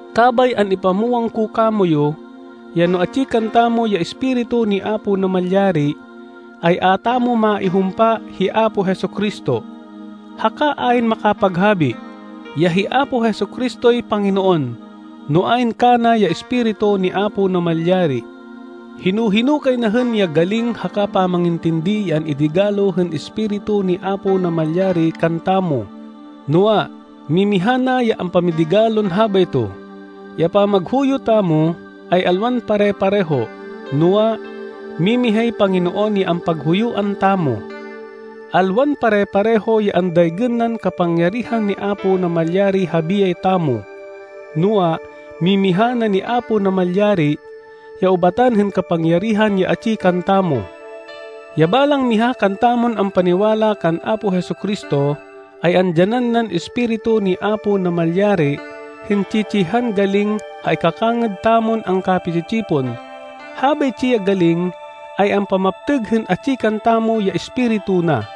Kabay an-ipamwang ko kamoyu, ya no atsi kantamo ya Espiritu ni Apo Namalyari, ay a tamo maihumpa hi Apo Jesu-Cristo. Haka ayn makapaghabi, ya hi Apo Jesu-Cristoy Panginoon, no ayn kana ya Espiritu ni Apo Namalyari. Hino-hino kay na hên ya galing haka pamangintindi ya an-idigalo hên Espiritu ni Apo Namalyari kantamo, noa, mimiha na ya ampamidigalon habayto. Ya pamaghuyo tamo ay alwan pare-pareho. Noa, mimihay Panginoon ya ampaghuyuan tamo. Alwan pare-pareho ya andaygên nan kapangyarihan ni Apo Namalyari ha biyay tamo, noa, mimiha na ni Apo Namalyari ya ubatan hên kapangyarihan ya atsi kantamo. Ya balang miha kantamon ampaniwala kan Apo Jesu-Cristo, ay andyanan nan Espiritu ni Apo Namalyari hên tsi-tsihan galing ha ikakangêd tamon angkapi-tsi-tsipon. Habaytsi ya galing ay ampamaptêg hên atsi kantamo ya Espiritu na.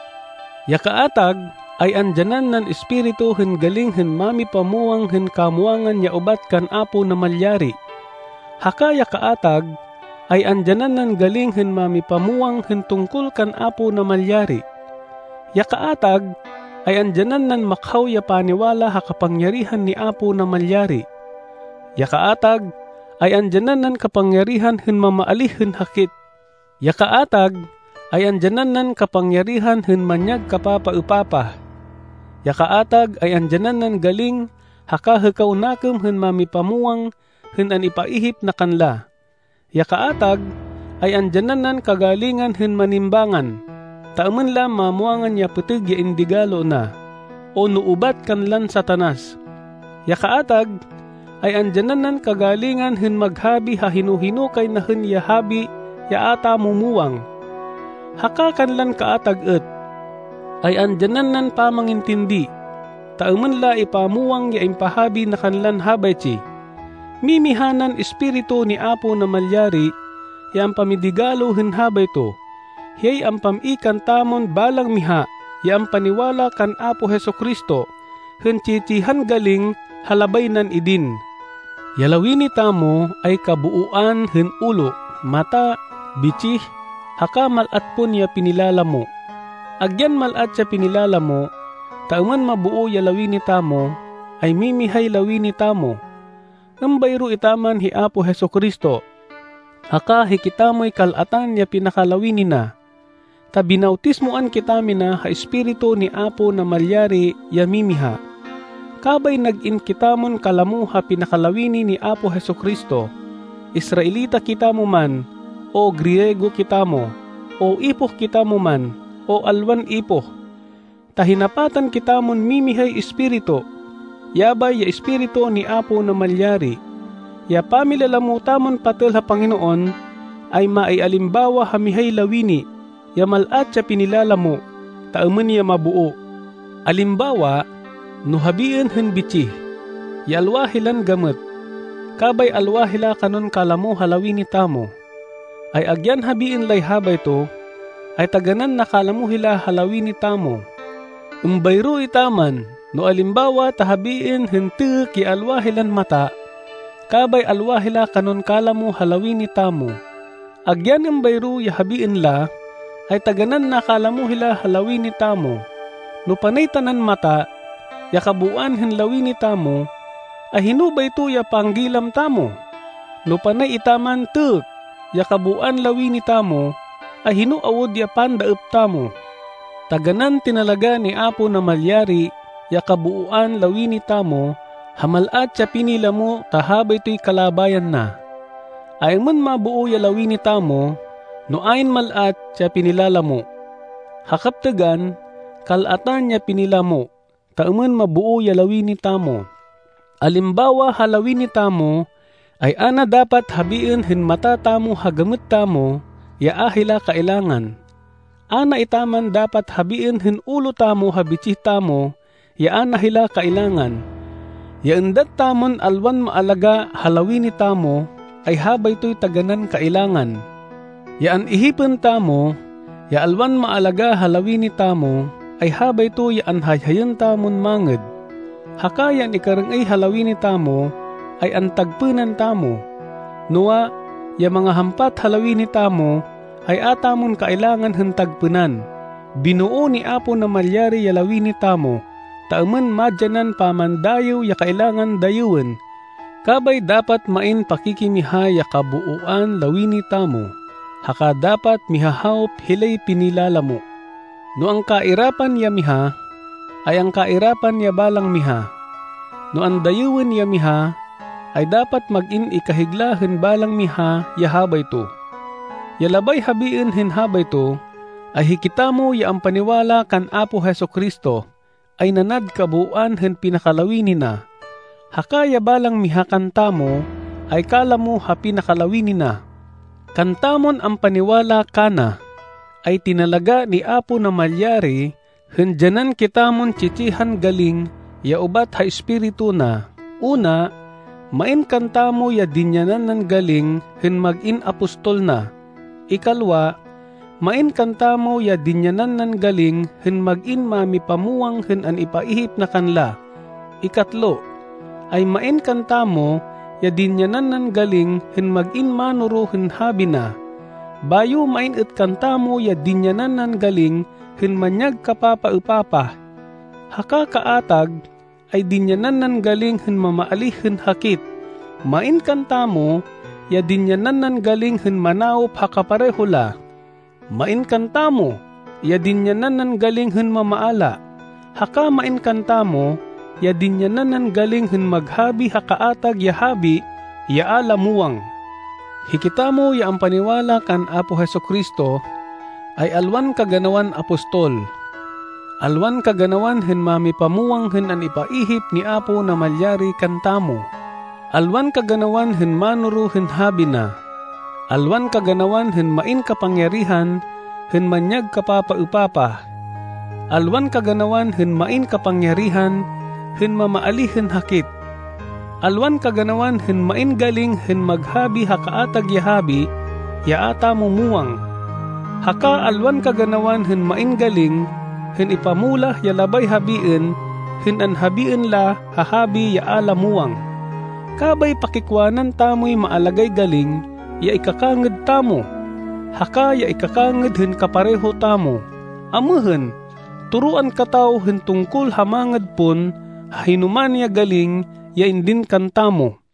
Ya kaatag ay andyanan nan Espiritu hên galing hên mamipamwang hên kamwangan ya ubat kan Apo Namalyari, haka ya kaatag, ay andyanan nan galing hên mamipamwang hên tungkol kan Apo Namalyari. Ya kaatag ay andyanan nan makhaw ya paniwala ha kapangyarihan ni Apo Namalyari. Ya kaatag ay andyanan nan kapangyarihan hên mamaalíh hên hakit. Ya kaatag ay andyanan nan kapangyarihan hên manyag kapapaêpapah. Ya kaatag ay andyanan nan galing haka hêkaw nakêm hên mamipamwang hên an-ipaihip na kanla. Ya kaatag, ay andyanan nan kagalingan hên manimbángan, ta êmên la mamwangan ya pêtêg ya indigalo na, o no ubat kanlan Satanas. Ya kaatag, ay andyanan nan kagalingan hên maghabi ha hino-hino kay na hên ya habi ya a tamo muwang. Haka kanlan kaatag êt, ay andyanan nan pamangintindi, ta êmên la ipamwang ya impahabi na kanlan habaytsi. Mimiha nan Espiritu ni Apo Namalyari ya ampamidigalo hên habayto. Hiyay ampam-i kantamon balang miha ya ampaniwala kan Apo Jesu-Cristo, hên tsi-tsihan galing ha labay nan idin. Ya lawini tamo ay kabooan hên ulo, mata, bitsih, haka mal-at pon ya pinilalamo. Agyan mal-at ya pinilalamo, ta êmên maboo ya lawini tamo, ay mimihay lawini tamo. Êmbayro etaman hi Apo Jesu-Cristo, haka hikitamoy kal-atan ya pinakalawini na. Ta binawtismoan kitamina ha Espiritu ni Apo Namalyari ya mimiha. Kabay nag-in kitamon kalamo ha pinakalawini ni Apo Jesu-Cristo, Israelita kitamo man, o Griego kitamo, o ipoh kitamo man, o alwan ipoh, ta hinapatan kitamon mimihay Espiritu, yabay ya Espiritu ni Apo Namalyari. Ya pamilalamo tamon patêl ha Panginoon ay maialimbawa ha mihay lawini, ya mal-at ya pinilalamo, ta êmên ya maboo. Alimbawa, no habiên hên bitsih, ya alwa hilan gamêt, kabay alwa hila kanon kalamo ha lawini tamo, ay agyan habiên lay habayto, ay taganán nakalamo hila ha lawini tamo. Êmbayro etaman no alimbawa ta habiên hên têkk ya alwa hilan mata, kabay alwa hila kanon kalamo ha lawini tamo, agyan êmbayro ya habiên la, ay taganán nakalamo hila ha lawini tamo. No panay tanan mata, ya kabooan hên lawini tamo, ay hino bayto ya panggilam tamo? No panay etaman têkk ya kabooan lawini tamo, ay hino awud ya pandaêp tamo? Taganán tinalagá ni Apo Namalyari ya kabooan lawini tamo ha mal-at ya pinilamo ta habaytoy kalabayan na. Ay-êmên maboo ya lawini tamo no ayn mal-at ya pinilalamo? Ha kaptêgan, kal-atan ya pinilamo, ta êmên maboo ya lawini tamo. Alimbawa ha lawini tamo, ay a na dapat habiên hên mata tamo ha gamêt tamo, ya a hila kailangan. A na etaman dapat habiên hên ulo tamo ha bitsih tamo, ya a na hila kailangan. Ya êndat tamon alwan maalagá ha lawini tamo, ay habaytoy taganán kailangan. Ya an-ihipên tamo, ya alwan maalagá ha lawini tamo, ay habayto ya anhayhayên tamon mangêd. Haka ya an-ikarêng-êy ha lawini tamo, ay antagpênan tamo. Noa, ya mangahampat ha lawini tamo, ay a tamon kailangan hên tagpênan. Binoo ni Apo Namalyari ya lawini tamo, ta êmên madyanan pamandayêw ya kailangan dayêwên. Kabay dapat main pakikimiha ya kabooan lawini tamo. Haka dapat mihahawop hilay pinilalamo. No angkairapan ya miha, ay angkairapan ya balang miha. No andayêwên ya miha, ay dapat mag-in ikahigla hên balang miha ya habayto. Ya labay habiên hên habayto, ay hikitamo ya ampaniwala kan Apo Jesu-Cristo, ay nanad kabooan hên pinakalawini na, haka ya balang miha kantamo ay kalamo ha pinakalawini na. Kantamon ampaniwala kana, ay tinalagá ni Apo Namalyari hên dyanan kitamon tsi-tsihan galing ya ubat ha Espiritu na. Una, main kantamo ya dinyanan nan galing hên mag-in apostol na. Ikalwa, main kantamo ya dinyanan nan galing hên mag-in mámipamwang hên an-ipaihip na kanla. Ikatlo, ay main kantamo ya dinyanan nan galing hên mag-in mánoro hên habi na. Bayo main êt kantamo ya dinyanan nan galing hên manyag kapapaêpapah, haka kaatag ay dinyanan nan galing hên mamaalíh hên hakit. Main kantamo ya dinyanan nan galing hên manawop ha kapareho la. Main kantamo ya dinyanan nan galing hên mamaala, haka main kantamo ya dinyanan nan galing hên maghabi ha kaatag ya habi ya a la muwang. Hikitamo ya ampaniwala kan Apo Jesu-Cristo, ay alwan kaganawan apostol, alwan kaganawan hên mámipamwang hên an-ipaihip ni Apo Namalyari kantamo, alwan kaganawan hên mánoro hên habi na, alwan kaganawan hên main kapangyarihan hên manyag kapapaêpapah, alwan kaganawan hên main kapangyarihan hên mamaalíh hên hakit, alwan kaganawan hên main galing hên maghabi ha kaatag ya habi ya a tamo muwang, haka alwan kaganawan hên main galing hên ipamulah ya labay habiên hên anhabiên la ha habi ya a la muwang. Kabay pakikwanan tamoy maalagáy galing ya ikakangêd tamo, haka ya ikakangêd hên kapareho tamo. Amêhên, toroan kataw hên tungkol ha mangêd pon, ha hinoman ya galing ya indin kantamo.